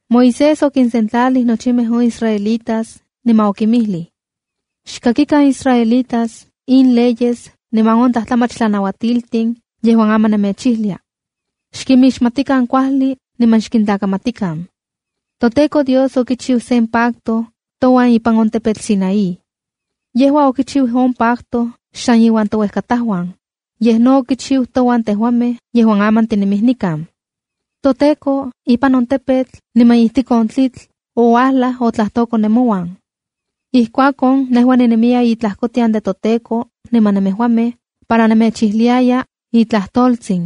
Moisés okinsentlalij nochimej on israelitas niman okinmijlij: —Xkakikan, israelitas, in leyes niman on tlajtlamach tlanauatiltin yejuan aman nemechijlia. Xkimixmatikan kuajli niman xkintlakamatikan. ’ToTEKO Dios okichiu sen pacto touan ipan on tepetl Sinaí. Yejua okichiu on pacto xsan iuan touejkatajuan, yej no okichiu touan tejuamej yejuan aman tinemij nikan. ToTEKO ipan on tepetl niman ijtik on tlitl, ouajlaj otlajtoko nemouan. Ijkuakon nejua ninemiya tlajkotian de toTEKO niman nemejuamej, para nemechijliaya itlajtoltsin,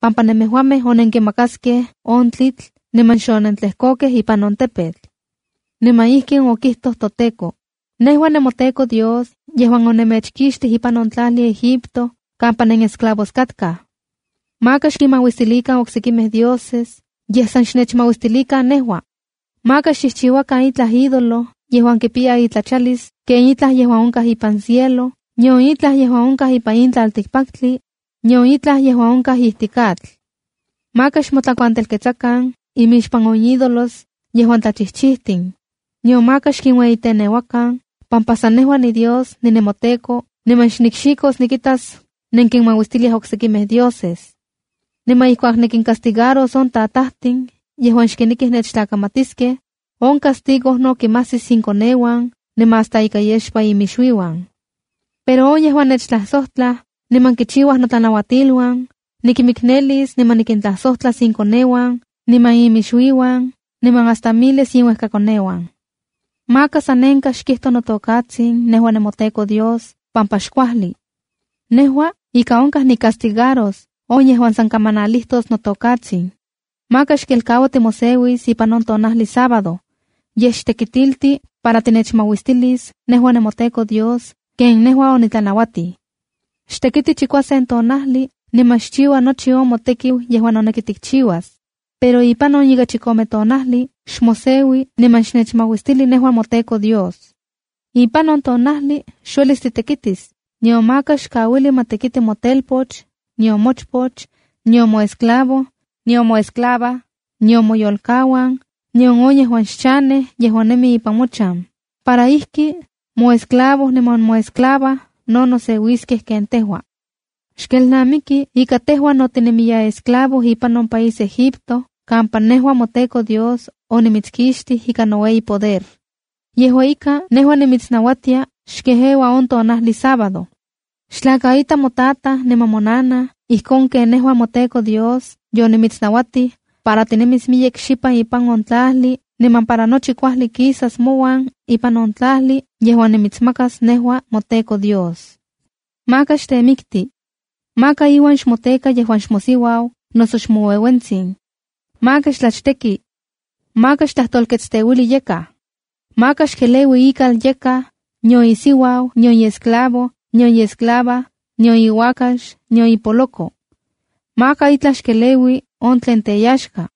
pampa nemejuamej onenkimakaskej on tlitl niman xonentlejkokej ipan on tepetl. Niman ijkin okijtoj toTEKO: ’“Nejua ninemoTEKO Dios yejuan onemechkixtij ipan on tlajli Egipto kampa nenesclavos katkaj. ’Maka xkinmauistilikan oksekimej dioses, yej san xnechmauistilikan nejua. ’Maka xchijchiuakan itlaj ídolo yejuan kipiya itlachalis ken itlaj yejuan onkaj ipan cielo, nion itlaj yejuan onkaj ipan in tlaltikpaktli, nion itlaj yejuan onkaj ijtik atl. Maka xmotlakuantelketsakan imixpan on ídolos yejuan tlachijchijtin, nion maka xkinueyiteneuakan, pampa san nejua niDios ninemoTEKO niman xnikxikos nikitas nenkinmauistiliaj oksekimej dioses. Niman ijkuak nikincastigaros on tatajtin yejuan xkinekij nechtlakamatiskej, on castigo no kimajsis inkoneuan, niman hasta ika yexpa inmixuiuan. Pero on yejuan nechtlajsojtlaj niman kichiuaj notlanauatiluan, nikinmiknelis niman nikintlasojtlas inkoneuan, niman inmixuiuan niman hasta miles iminuejkakoneuan. ’Maka san nenkaj xkijto notokatsin nejua moTEKO Dios, pampa xkuajli. Nejua ika onkaj nicastigaros on yejuan san kamanalijtos notokatsin. ’Maka xkelkaua timoseuis ipan on tonajli Sábado, yej xtekitilti para tinechmauistilis nejua moTEKO Dios ken nejua onitlanauatij. Xtekiti chikuasen tonajli niman xchiua nochi on motekiu yejuan noneki tikchiuas. Pero ipan on ika chikome tonajli, xmoseui niman xnechmauistili nejua moTEKO Dios. Ipan on tonajli xuelis titekitis, nion maka xkauili ma tekiti motelpoch, nion mochpoch, nion moesclavo, nion moyolkauan, nion on yejuan xchanej yejuan nemi ipan mochan. Para ijki moesclavo niman moesclava no noseuiskej ken tejua. Xkelnamiki ika tejua no tinemiya esclavo ipan on país Egipto kampa nejua moTEKO Dios onimitskixtij ikan noueyipoder. Yejua ika, nejua nimitsnauatia xkejeua on tonajli sábado. ’Xtlakaita motataj niman monanaj ijkon ken nejua moTEKO Dios yonimitsnauatij, para tinemis miyek xipan ipan on tlajli niman para nochi kuajli kisas mouan ipan on tlajli yejuan nimitsmakas nejua moTEKO Dios. ’Maka xtemikti. ’Maka iuan xmoteka yejuan xmosiuau noso xmoueuentsin. ’Maka xtlachteki. ’Maka xtlajtolketsteuili yakaj. ’Maka xkeleui ikal yakaj, nion isiuau, nion iesclavo, nion iesclava, nion iuakax, nion ipoloko. Maka itlaj xkeleui on tlen teyaxka.”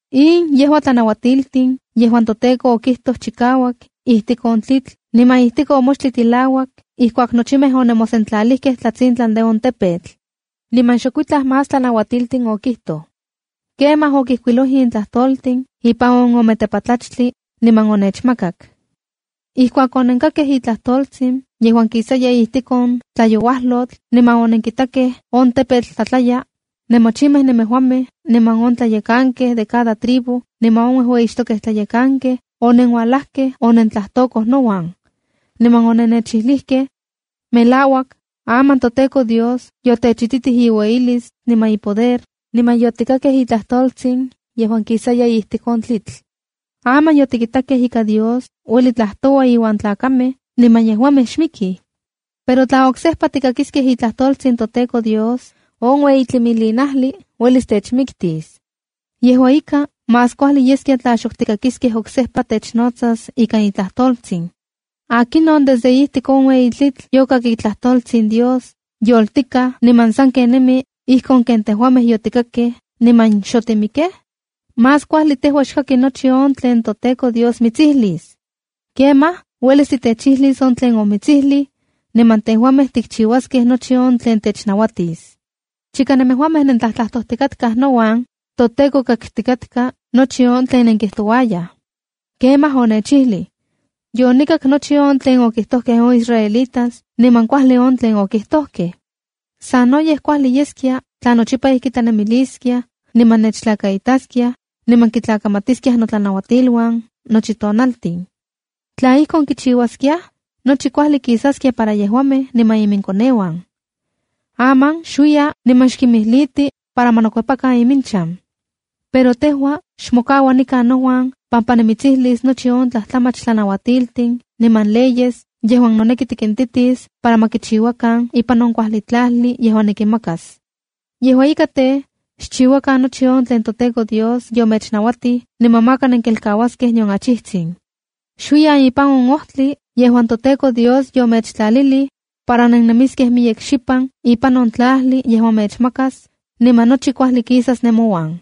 ’In yejua tlanauatiltin yejuan toTEKO okijtoj chikauak ijtik on tlitl niman ijtik on moxtli tilauak ijkuak nochimej onemosentlalijkej tlatsintlan de on tepetl. Niman xokuitlaj más tlanauatiltin okijtoj. Kemaj okijkuiloj in tlajtoltin ipan ome tepatlachtli, niman onechmakak. Ijkuak onenkakkej itlajtoltsin yejuan kisaya ijtik on tlayouajlotl niman onenkitakej on tepetl tlatlaya, nemochimej nemejuamej, niman on tlayekankej de cada tribu niman on uejueyixtokej tlayekankej onenuajlajkej onentlajtokoj nouan. Niman onennechijlijkej: “Melauak, aman toTEKO Dios yotechititij iueyilis niman ipoder, niman yotikakkej itlajtoltsin yejuan kisaya ijtik on tlitl. Aman yotikitakej ika Dios ueli tlajtoua iuan tlakamej niman yejuamej xmikij. Pero tla oksejpa tikakiskej itlajtoltsin toTEKO Dios, on ueyi tlimilinajli uelis techmiktis. Yejua ika, más kuajli yeskia tla xok tikakiskej oksejpa technotsas ikan itlajtoltsin. ¿Akinon desde ijtik on ueyi tlitl yokak itlajtoltsin on Dios yoltikaj niman sanken nemi ijkon ken tejuamej yotikakkej niman xotimikej? Más kuajli tejua xkaki nochi on tlen toTEKO Dios mitsijlis. Kemaj uelis titechijlis on tlen omitsijlij, niman tejuamej tikchiuaskej nochi on tlen technauatis.” ’Chika nemejuamej nentlajtlajtojtikatkaj nouan, toTEKO kaktikatka nochi on tlen nenkijtouayaj. Kemaj onechijlij: “Yonikak nochi on tlen okijtojkej on israelitas niman kuajli on tlen okijtojkej. Sanoyej kuajli yeskia tla nochipa ijki tlanemiliskiaj, niman nechtlakaitaskiaj, niman kitlakamatiskiaj notlanauatiluan nochi tonaltin. Tla ijkon kichiuaskiaj, nochi kuajli kisaskia para yejuamej niman iminkoneuan. Aman xuiya niman xkinmijliti para ma nokuepakan iminchan. Pero tejua xmokaua nikan nouan pampa nimitsijlis nochi on tlajtlamach tlanauatiltin niman leyes yejuan noneki tikintitis para ma kichiuakan ipan on kuajli tlajli yejuan nikinmakas. ’Yejua ika tej, xchiuakan nochi on tlen toTEKO Dios yomechnauatij niman maka nenkelkauaskej nion achijtsin. ’Xuiyan ipan on ojtli yejuan toTEKO Dios yomechtlalilij para nennemiskej miyek xipan ipan on tlajli yejuan mechmakas, niman nochi kuajli kisas nemouan.